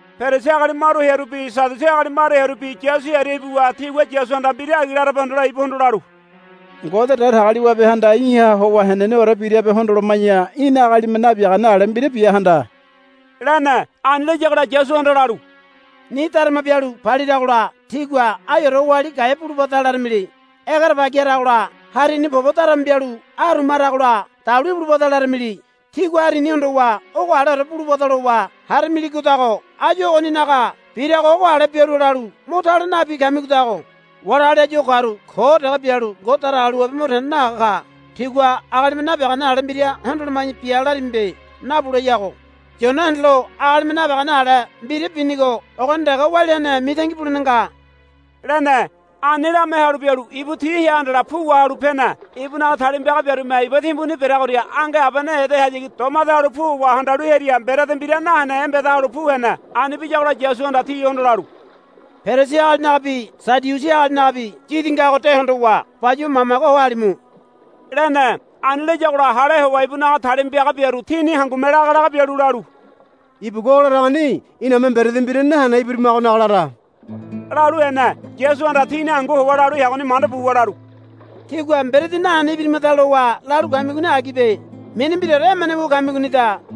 Perisi agali maru hearubi Sadiusi agali maru hearubi Yasu hearia ibuwa tigua Yasuhanda mbira agi larabe hondole ibuhondo lalu, Ngode Datagaliwabehanda í̠ha howa heneneore birabe hondoloma̱ya í̠na agalime nabiagane ale mbira bia handa, lene. Ani layagola Yasuhanda lalu, Ni darama bialu paliragola tígua, Aiore oali gaea bulubada, laramili. Egerebagi haragola harini pobo darama bialu aruma haragola, Dalu ibulubada, laramili. Tígua harini hondowa ogo aleore bulubada lowa haramiligodago áyu ogoninaga birago ogo ale biarua lalu mo tale nabi kamigodago. Wali agali áyu o karu ko dege bialu Ngode Datagaliwabe mo tene nahaga ka. Tígua, Agalime nabiagane ale mbira hondoloma̱ya bia, larimibe. Nabuleyago. Yona hendelo agalime nabiagane ale mbira binigo ogoni dege walia hene mitangi bulene nga, lene. Ani lame halu bialu ibu ti hea handala pu wahalu pene. Ibunaga talima piaga biarume iba timbuni bereagoria ange abene edehayagi domade halu pu howa handalu hearia mberedi mbira nahene embeda halu pu hene. Ani biyagola Yasuhanda tihondo lalu, Perisi agalinagabi Sadiusi agalinagabi yidi ngago de hondowa bayuwa mamage ho halimu, lene. Ani layagola hale howa ibunaga talima piaga biaru tini hangume laga laga bialu lalu, Ibugua o laragoni iname mberedi mbira nahene ibirimagonaga lara, lalu hene. Yasuhanda tini hangu howa lalu heagoni manda buwa lalu, Tígua mberedi nahene ibirimada lowa lalu kamigoni agibe. Mini mbiraore emene wu kamigonida.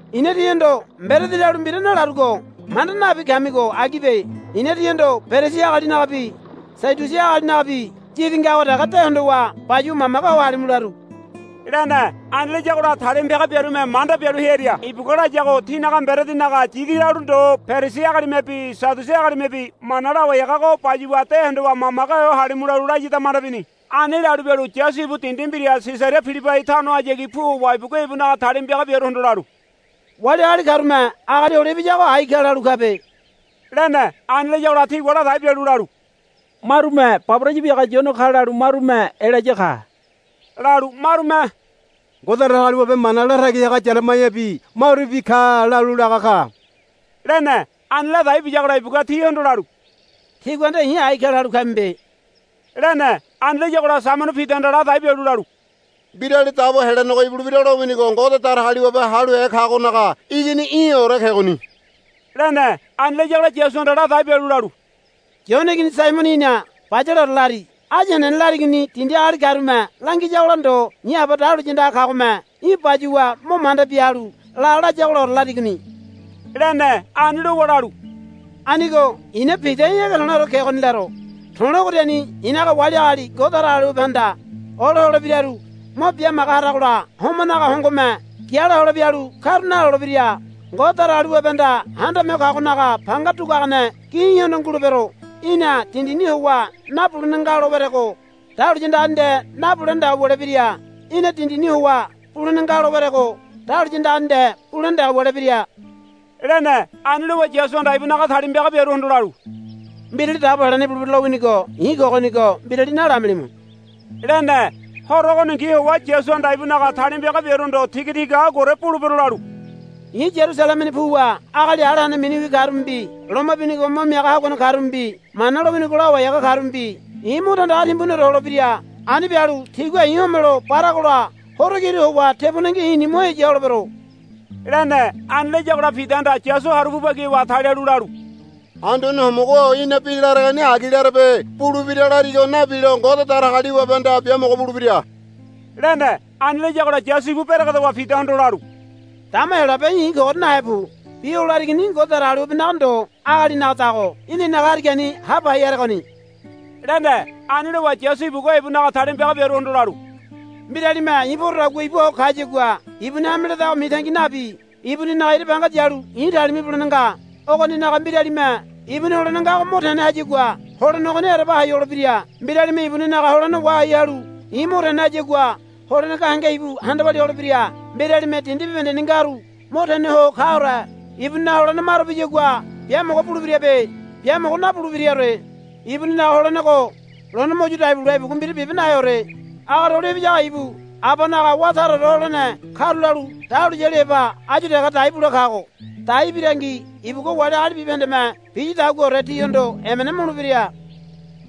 I̱na tíhondo mberedi lalu mbira nalarugo manda nabi kamigo agibe. I̱na tíhondo Perisi agalinagabi Sadiusi agalinagabi yidi ngago dege de hondowa bayuwa mamage ho halimu laru, lene. Ani layagola talima piaga biarume manda bialu hearia ibugua layago tinaga mberedinaga yidi lalu ndo Perisi agalimebi Sadiusi agalimebi mana lawai hagago bayuwa de hondowa mamage ho halimu lalu layada manda bini. Ani lalu bialu Yasu ibu dindi mbira Sisaria Pilibai tanohayagi pu howa ibugua ibunaga talima piaga biaruhondo lalu, Wali agali karume Agali Hole Ibiyago ai ka lalu kabe, lene. Ani layagola tigua ladai bialu lalu, Marume, Baboraya biaga Yone ka, lalu marume, Elaya ka, lalu marume, Ngode Datagaliwabe mana latagi haga Yaremaiabi marubi ka, lalu laga ka, lene. Ani ladai biyagola ibugua tihondo lalu, Tígua nde i̱ ai ka lalu kamibe, lene. Ani layagola Saimono Pidahanda ladai bialu lalu, Mbirali Dabo Helenego ibulebira lowinigo Ngode Datagaliwabe haluhe kagonaga Igini í̠ore kegoni, lene. Ani layagola Yasuhanda ladai bialu lalu, Yone igini Saimono í̠na bayaleore lari. Áyu henene larigoni dindi agali karume langiyagola ndo i̱ Aba dahuliya andaga kagome í̠ bayuwa mo manda bia halu, La, layagolaore larigoni, lene. Ani lowa lalu, Anigo i̱na Pida í̠ ege to̱le̱ore kegoni laro. To̱le̱ ogoriani i̱naga wali agali Ngode Datagaliwabehanda olo holebiraru mo bimaga harogola homanaga hongome giala hole bialu karu nalolebira. Ngode Datagaliwabehanda Handame Ho Kagonaga panga duguagane gi í̠hondo ngulebero. Í̠na dindini howa nabulene nga lo werego dahuliya andagani nde nabulene dege wulebira. Í̠na dindini howa bulene nga lo werego dahuliya andagani nde bulene dege wulebira, lene. Ani lowa Yasuhanda ibunaga talima piaga biaruhondo lalu, Mbirali Dabo Helenego ibulebira lowinigo i̱ kogonigo mbirali nalamilimu, lene. Horo ogoningi howa Yasuhanda ibunaga talima piaga biaruhondo tigatiga aguaore bulebero lalu, I̱ Yarusalemeni puwa agali ala hene miniwi karumebi loma binigo mo miaga haguane karumebi Mana lowinigo lawai haga karumebi i̱ mo tandaga timbuniore holebira. Ani bialu tigua i̱ homelo baragola horo kiru howa tebonengi i̱ni mo heya holebero, lene. Ani layagola Pidahanda Yasu haru pu bagi howa talialu lalu, Anduane Homogo-o í̠na bi laregoni agi larebe. Bulebira larigo nabilo Ngode Datagaliwabehanda biamogo bulebira, lene. Ani layagola Yasu ibu beregedowa Pidahondo lalu, Dama Heyolabe í̠ i̱ kogoria nahe pu. Bi o larigoni Ngode Datagaliwabenaga ndo agalinagadago í̠na i̱naga harigani ha pai haregoni, lene. Ani lowa Yasu ibugua ibunaga talima piaga biaruhondo lalu, Mbiralime i̱ porodagua ibua ho kayagua ibuni hame ledago mitangi nabi ibuninaga ira banga yalu i̱ talima ibulene nga. Ogoninaga mbiralime ibuni holene ngago mo tene hayagua holene ogoni ereba hai holebira. Mbiralime ibuninaga holene wahai halu i̱ mo tene hayagua holene gahenge ibu handa walia holebira. Mbiralime dindi bibahendeni ngaru mo tene ho kaore ibuninaga holene maro biyagua biamogo bulebirabe. Biamogo nabulebiraore. Ibuninaga holenego lone mo yu dai bule ibugua mbira bibe naheore. Agali Hole Ibiyago ibu Abanaga wá taraore holene karulalu dahuliyali heba áyu dege daibule kago. Dai birangi ibugua wali agali bibahendeme biyadaguaore tihondo emena mulebira.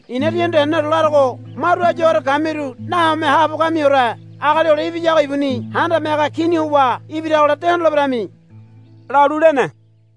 I̱na tíhondo heneneore larogo maru áyu ogoria kamiru nahome haabo kamiore Agali Hole Ibiyago ibuni Handame Haga Kini howa ibiragola de hondoleberemi, lalu lene.